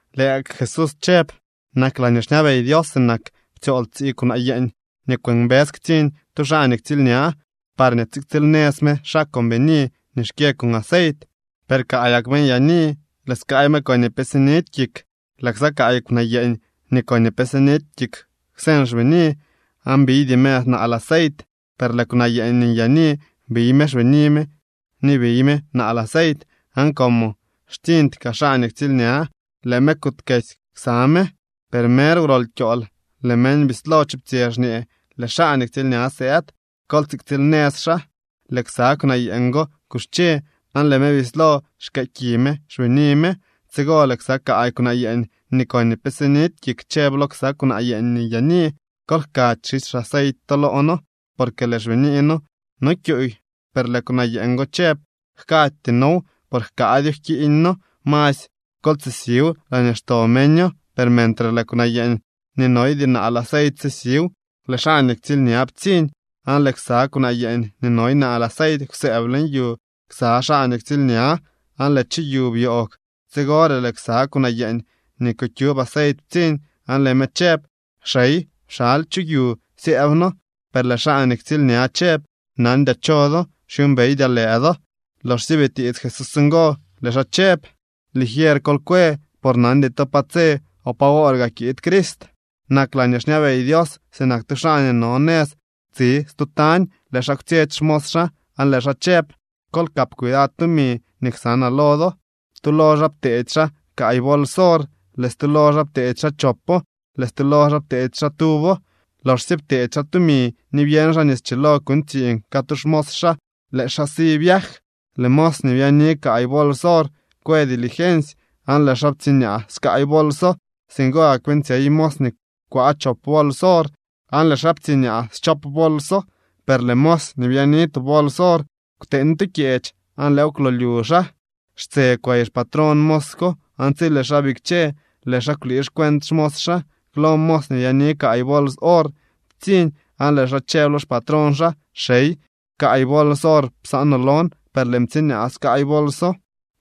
Lëë gak Jesús chëb: —Nak laañee xñabey Dios sinak nii ptsyool tsii kwnaa yeeñ nii kwëmbës ktsiñ tu xaa nii ktsiilña, parñee tsiktsiil nëz me xaa con bini nii xkyë con aceit. Per kaayak me nyaani, lëë skaay me koñee pe sinidy kik. Lëë ksa kaay kwnaa yeeñ nii koñee pe sinidy kik kwseñ xbini, aan biydy me naal aceit. Per lëë kwnaa yeeñ nii nyaani biy me xbini me ni biy me naal aceit. Aan como xtsiñdy kaa xaa nii ktsiilña, lëë me kuutkesy ksa me. Per mer wrol kyool, lëë meñ bislo chuptsyë, xñee: “¡Lëë xaa nii ktsiilña sëëd. Kol tsiktsiil nëz xaa!” Lëë ksa kwnaa yeeñ go kuxche, aan lëë me bislo xkëë ki me xbini me. Tsigo lëë ksa kaay kwnaa yeeñ nii koñee pe sinidy kik chëb lo ksa kwnaa yeeñ nii nyaani: “Kol jkady xisy xaceit to loo noo, porque lëë xbinii noo no kyuuy.” Per lëë kwnaa yeeñ go chëb: “Jkaajty noow, por jkaadyo jkiiñ noo. Masy kol tsisiw laañee xto meño.” Per mentre lëë kwnaa yeeñ nii noydy naal aceit sisiw, lëë xaa nii ktsiilña ptsiñ. Aan lëë ksa kwnaa yeeñ nii noy naal aceit kwsëëb leñ yu ksa xaa nii ktsiilña, aan lëë chu yu byoogw. Tsigore lëë ksa kwnaa yeeñ nii kukyub aceit ptsiñ aan lëë me chëb: “¡Xey, pxaly chu yu syëëb noo!” Per lëë xaa nii ktsiilña chëb: “Nandyaa cho do, xyuumbeydyaa lëë do.” Loxsye bitiits Jesús ngo, lëë xaa chëb: —Ligier kol kwe, por nandy to pa tse o pa woor gaa kiid Crist. ’Nak laañee xñabey Dios sinak tu xaa nii no nëz tsi stu tañ. Lëë xaa kwtsyetsy xmos xaa aan lëë xaa chëb: “Kol kap cuidad tumi nii ksanaa lo do.” ’Tu lo xaa pteedy xaa kaay bols or, lëë stu lo xaa pteedy xaa chopo, lëë stu lo xaa pteedy xaa tuwo. Loxsye pteedy xaa tumi nii byeñ xaa nii schilo kuuñ tsiiñ catu xmos xaa, lëë xaa si viaj. Lëë mos nii byaani kaay bols or kwë dilgensy aan lëë xaa ptsiñaa skaay bolso. Singo gak beeñtsyey mos nii kwaa chop bols or, aan lëë xaa ptsiñaa schop bolso. Per lëë mos nii byaani tu bols or kwteeñ tu kyeech, aan lëëw kwlolyu xaa. ’Xtse kwey xpatrón mos ko aan tsi lëë xaa bikche, lëë xaa kwlii xcuent xmos xaa. Klo mos nii byaani kaay bols or ptsiñ, aan lëë xaa chëb lo xpatrón xaa: “Xey, kaay bols or psaanoo lon. Per lëën ptsiñaa skaay bolso.”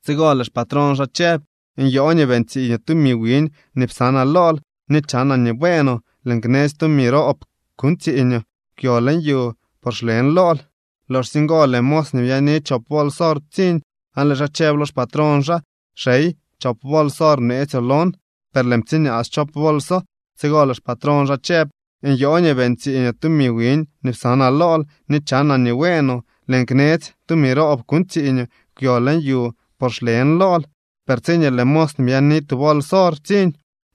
Tsigo lëë xpatrón xaa chëb: “Nyoo nii beeñ tsiiñoo tumi wiñ nii psanaa lool, ni chanaa nii bueenoo. Lëën knetsy tumi roob kuuñ tsiiñoo. Kwyo leñ yu, por xlen lool.” Loxsye ngo lëë mos nii byaani chop bols or ptsiñ aan lëë xaa chëb lo xpatrón xaa: “Xey, chop bols or bneetsyoo lon, per lëën ptsiñaa schop bolso.” Tsigo lëë xpatrón xaa chëb: “Nyoo nii beeñ tsiiñoo tumi wiñ nii psanaa lool, ni chanaa nii bueenoo. Lëën knetsy tumi roob kuuñ tsiiñoo. Kwyo leñ yu por xlen lool.” Per tsiñee lëë mos nii byaani tu bols or ptsiñ,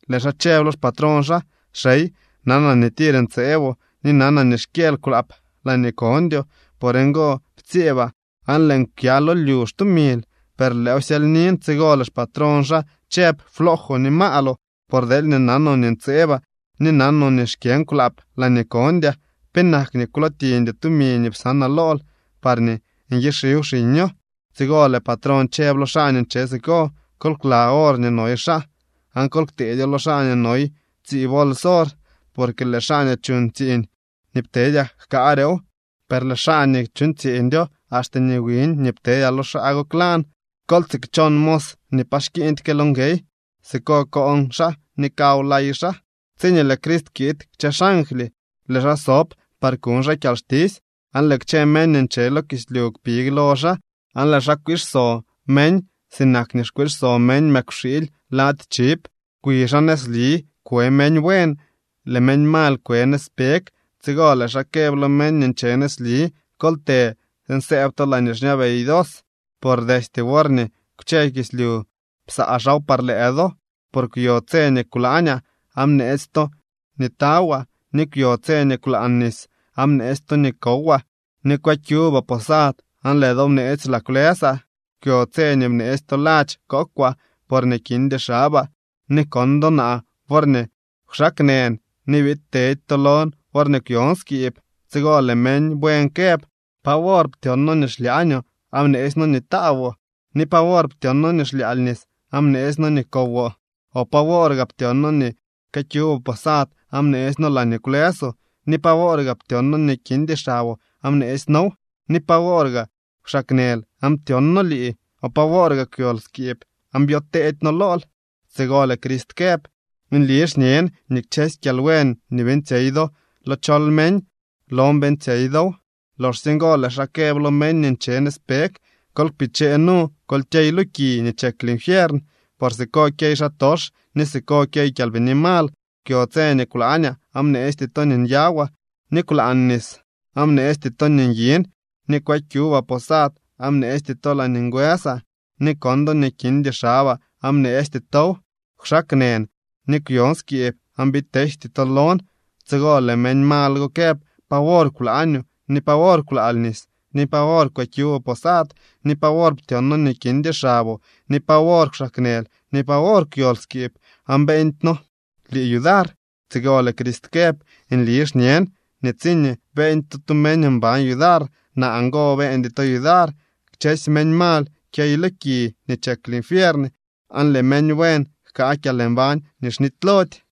lëë xaa chëb lo xpatrón xaa: “Xey, nanaa nii tir ntseeboo, ni nanaa nii xkyëël kwlaap laañee kondyoo. Por ngo ptsyeebaa, aan lëën kwya lo lyu xtumil. Per lëëw syelynin.” Tsigo lëë xpatrón xaa chëb: “Floojoo ni maaloo, por deelñee nanoo nii ntseebaa ni nanoo nii xkyën kwlaap laañee kondyaa, ¿penak nii kwlootiñdyoo tumi nii psanaa lool parñee nyixiw xiño?” Tsigo lëë patrón chëb lo xaa nii nche siko: “Kol kla or nii noy xaa, aan kol kteedyo lo xaa nii noy tsii bols or. Porque lëë xaa nii chuuñ tsiiñ nii ptedyaa jkaarew, per lëë xaa nii chuuñ tsiiñdyo, axte nii wiñ ptedyaa lo xaa go klan. Kol tsikchon mos nii pa xkiiñdyke lo nguey. Siko koon xaa ni kaw lay xaa.” ’Tsiñee lëë Crist kiid kchë xangly, lëë xaa sob par kuñ xaa kyalxtisy. Aan lëë kchë meñ nii nche lo kislyu kpig lo xaa, aan lëë xaa kwiixso meñ sinak nii kwiixso meñ mëkwxiily lady chiv. Kwi xaa nëzli kwe meñ buen, lëë meñ mal kwe nëzpeg. Tsigo lëë xaa këb lo meñ nii nche nëzli: “Kol të tsiin sëëb to laañee xñabey Dios, por destye worñee kwche kislyu psaa xaaw par lëë do. Por kwyo tse nii kwlaañaa, aan bneetsy to nii tawaa, ni kwyo tse nii kwlaan nis, aan bneetsy to nii kowaa, ni kwëkyubaa posad, aan lëë do bneetsy laa kwlësaa. Kwyo tse nii bneetsy to ladx kookwaa porñee kindy xabaa, ni kon do naa worñee kwxaaknën, ni biid tedy to lon worñee kwyon skiib.” Tsigo lëë meñ buen këb: “¿Pa wor ptyon noo nii xlyaañoo, aan bneetsy noo nii taawoo? ¿Ni pa wor ptyon noo nii xlyaal nis, aan bneetsy noo nii kowoo? ¿O pa woor gaa ptyon noo nii këkyuboo posad aan bneetsy noo laañee kwlësoo, ni pa woor gaa ptyon noo nii kindy xaboo aan bneetsy noow? ¿Ni pa wor kwxaaknël aan ptyon noo lii, o pa woor gaa kwyol skiib aan byoteedy noo lool?” Tsigo lëë Crist këb: “Nli xñen nii kchësy kyalbuen nii beeñtsyey do lo chol meñ, lon beeñtsyey dow.” ’Loxsye ngo lëë xaa këb lo meñ nii nche nëzpeg: “Kol kpichee nu, kol kyey lo ki nii chek linfiern, por siko kyey xaatox ni siko kyey kyalbini mal. Kwyo tse nii kwlaañaa, aan bneesty to nii nyawaa, ni kwlaan nis, aan bneesty to nii nyin. Ni kwëkyubaa posad aan bneesty to laañee ngwësaa, ni kon do nii kindy xabaa aan bneesty tow. Kwxaaknën ni kwyon skiib aan biid teejty to lon.” Tsigo lëë meñ mal go këb: “¿Pa wor kwlaañoo, ni pa wor kwlaal nis, ni pa wor kwëkyuboo posad, ni pa wor ptyon noo nii kindy xaboo, ni pa wor kwxaaknël, ni pa wor kwyol skiib, aan beeñdy noo lii yudar?” Tsigo lëë Crist këb: “Nli xñen nii tsiñee beeñdy to tu meñ mban yudar, naa ngo beeñdy to yudar.” Kchësy meñ mal kyey lo ki nii chek linfiern, aan lëë meñ buen jkaa kyalmbañ nii xnitylody.